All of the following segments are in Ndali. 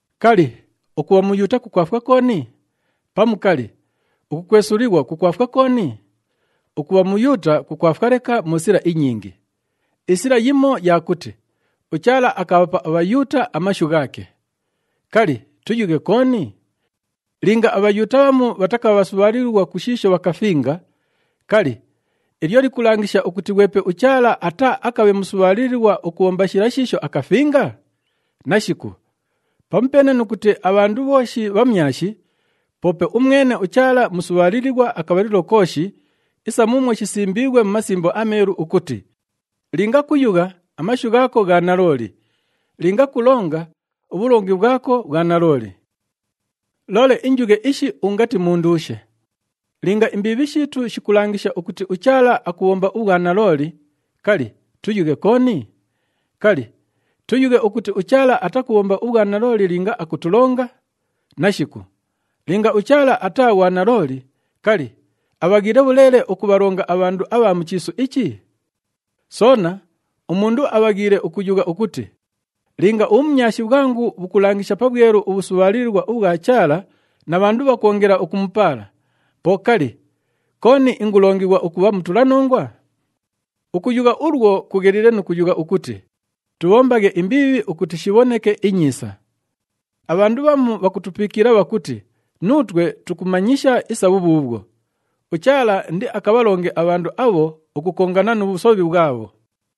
Kali, ukubha Muyuuta kukwafwa kooni? Pamu kali, ukukwesulighwa kukwafwa kooni? Ukubha Muyuuta kukwafwa leka mu sila inyingi. Isila yimo ya kuti uChaala akabhapa aBhayuuta amashu ghaake. Kali, tuyughe kooni? Linga aBhayuuta bhamu bhatakabha bhasubhaalilighwa ku shiisho bhakafinga, kali, ilyo likulangisha ukuti ghwepe uChaala ataaakabhe musubhaalilighwa ukubhomba shila shiisho akafinga? Nashiku! Pamupeene nu kuti abhandu bhooshi bhamyashi, poope umwene uChaala musubhaalilighwa akabhalilo kooshi, isa muumwo shisimbiighwe mu Masimbo aMeelu ukuti, “Linga kuyugha, amashu ghaako gha nalooli. Linga kulonga, ubhulongi bhwako bhwa nalooli.” Loole injughe ishi ungati munduushe. Linga imbiibhi shiitu shikulangisha ukuti uChaala akubhomba ubhwanalooli, kali, tuyughe kooni? Kali, tuyughe ukuti uChaala atakubhomba ubhwanalooli linga akutulonga? Nashiku! Linga uChaala ataa ghwanalooli, kali, abhaghiile bhuleele ukubhalonga abhandu abha mu chiisu ichi? Soona, umundu abhaghiile ukuyugha ukuti, “Linga ubhumyashi bhwangu bhukulangisha pabhwelu ubhusubhaalilighwa ubhwa Chaala na bhandu bhakwongela ukumupaala, po kali, kooni ingulongighwa ukubha mutulanongwa?” Ukuyugha ulwo kugheliile nu kuyugha ukuti, “Tubhombaghe imbiibhi ukuti shibhoneke inyiisa!” Abhandu bhamu bhakutupiikila bhakuti nuutwe tukumanyisha isa bhubhuubhwo. UChaala indiakabhalonge abhandu abho ukukongana nu bhusobhi bhwabho.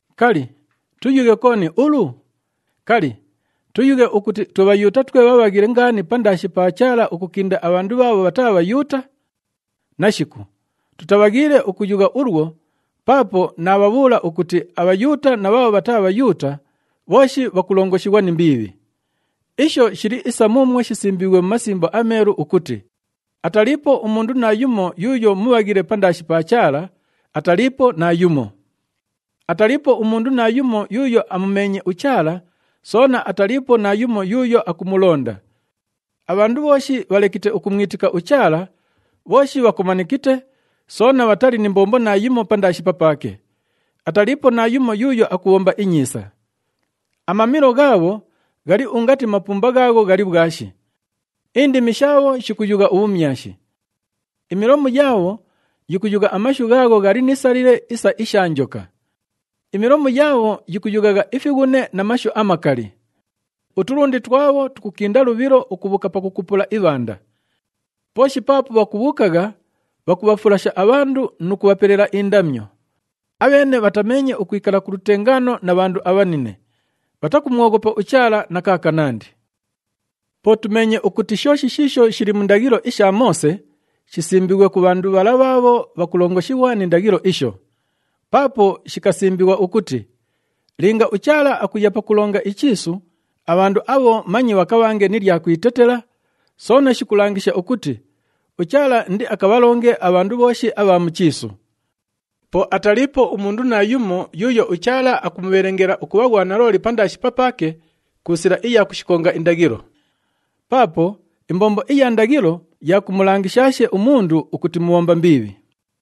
Kali, tuyughe kooni ulu? Kali, tuyughe ukuti twe Bhayuuta twe bhabhaghile ngaani pandaashi pa Chaala ukukinda abhandu bhaabho bhataa Bhayuuta? Nashiku! Tutabhaghiile ukuyugha ulwo paapo naabhabhuula ukuti aBhayuuta na bhaabho bhataa Bhayuuta bhooshi bhakulongoshighwa ni mbiibhi. Isho shili isa muumwo shisimbiighwe mu Masimbo aMeelu ukuti, “Ataliipo umundu naayumo yuuyo mubhaghile pandaashi pa Chaala, ataliipo naayumo. Ataliipo umundu naayumo yuuyo amumeenye uChaala, soona ataliipo naayumo yuuyo akumulonda. Abhandu bhooshi bhalekite ukumwitika uChaala, bhooshi bhakomanikite soona bhatali ni mbombo naayimo pandaashi papaake. Ataliipo naayumo yuuyo akubhomba inyiisa.” “Amamilo ghaabho ghali ungati mapumba ghaagho ghali bhwashi. Indimi shaabho shikuyugha ubhumyashi.” “Imilomu yaabho yikuyugha amashu ghaagho ghali ni salile isa isha njoka.” “Imilomu yaabho yikuyughagha ifighune na mashu amakali.” “Utulundi twabho tukukinda lubhilo ukubhuuka pakukupula ibhanda. Pooshi paapo bhakubhuukagha, bhakubhafulasha abhandu nu kubhapelela indamyo. Abheene bhatameenye ukwikala ku lutengaano na bhandu abhanine.” “Bhatakumwoghopa uChaala na kaakanandi.” Po tumeenye ukuti shooshi shiisho shili mu ndaghilo isha Moose, shisimbiighwe ku bhandu bhala bhaabho bhakulongoshighwa ni ndaghilo isho. Paapo shikasimbighwa ukuti linga uChaala akuya pakulonga ichiisu, abhandu abho manye bhakabhange ni lya kwitetela, soona shikulangisha ukuti uChaala indiakabhalonge abhandu bhooshi abha mu chiisu. Po ataliipo umundu naayumo yuuyo uChaala akumubhelengela ukubha ghwanalooli pandaashi papaake ku sila iya kushikonga indaghilo. Paapo imbombo iya ndaghilo ya kumulangishaashe umundu ukuti mubhomba mbiibhi.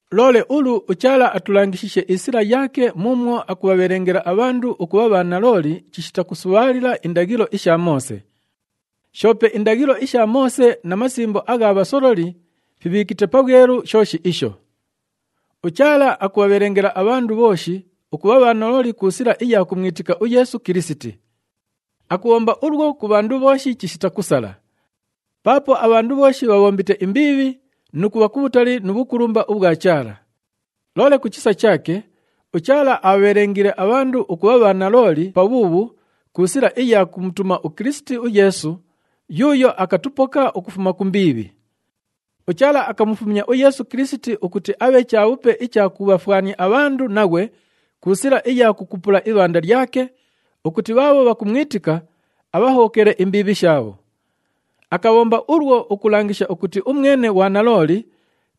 Loole ulu uChaala atulangishiishe isila yaake muumwo akubhabhelengela abhandu ukubha bhanalooli chishita kusubhaalila indaghilo isha Moose. Shoope indaghilo isha Moose na masimbo agha bhasololi fibhiikite pabhwelu shooshi isho. UChaala akubhabhelengela abhandu bhooshi ukubha bhanalooli ku sila iya kumwitika uYeesu Kilisiti. Akubhomba ulwo ku bhandu bhooshi chishita kusala. Paapo abhandu bhooshi bhabhombite imbiibhi nu kubha kubhutali nu bhukulumba ubhwa Chaala. Loole ku chisa chaake, uChaala abhabhelengiile abhandu ukubha bhanalooli pabhuubhu ku sila iya kumutuma Kilisiti uYeesu yuuyo akatupoka ukufuma ku mbiibhi. UChaala akamufumya uYeesu Kilisiti ukuti abhe chabhupe icha kubhafwania abhandu naghwe ku sila iya kukupula ibhanda lyake, ukuti bhaabho bhakumwitika abhahobhokele imbiibhi shaabho. Akabhomba ulwo ukulangisha ukuti umwene ghwanalooli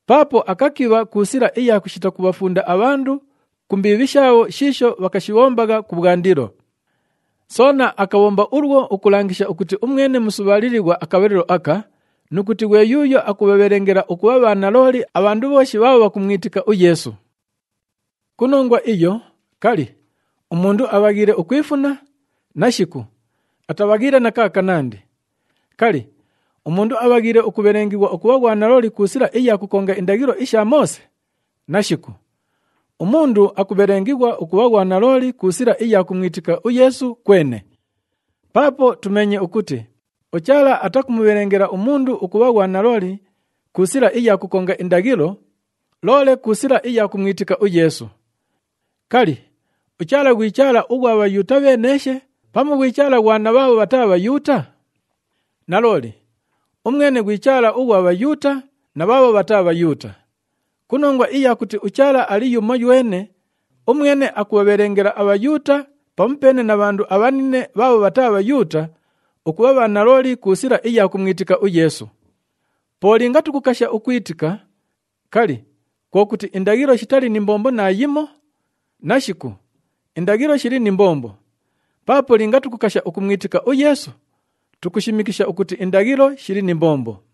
paapo akakibha ku sila iya kushita kubhafunda abhandu ku mbiibhi shaabho shiisho bhakashibhombagha kubhwandilo. Soona akabhomba ulwo ukulangisha ukuti umwene musubhaalilighwa akabhalilo aka, nu kuti ghwe yuuyo akubhabhelengela ukubha bhanalooli abhandu bhooshi bhaabho bhakumwitika uYeesu. Ku nongwa iyo, kali, umundu abhaghiile ukwifuna? Nashiku atabhaghiile na kaakanandi! Kali, umundu abhaghiile ukubhelengighwa ukubha ghwanalooli ku sila iya kukonga indaghilo isha Moose? Nashiku! Umundu akubhelengighwa ukubha ghwanalooli ku sila iya kumwitika uYeesu kwene. Paapo tumeenye ukuti uChaala atakumubhelengela umundu ukubha ghwanalooli ku sila iya kukonga indaghilo, loole ku sila iya kumwitika uYeesu. Kali, uChaala ghwi Chaala ughwa Bhayuuta bheeneeshe pamu ghwi Chaala ghwa na bhaabho bhataa Bhayuuta? Nalooli, umwene ghwi Chaala ughwa Bhayuuta na bhaabho bhataa Bhayuuta. Ku nongwa iya kuti uChaala ali yumoywene, umwene akubhabhelengela aBhayuuta pamupeene na bhandu abhanine bhaabho bhataa Bhayuuta ukubha bhanalooli ku sila iya kumwitika uYeesu. Po linga tukukasha ukwitika, kali, kwo kuti indaghilo shitali ni mbombo naayimo? Nashiku, indaghilo shili ni mbombo! Paapo linga tukukasha ukumwitika uYeesu, tukushimikisha ukuti indaghilo shili ni mbombo.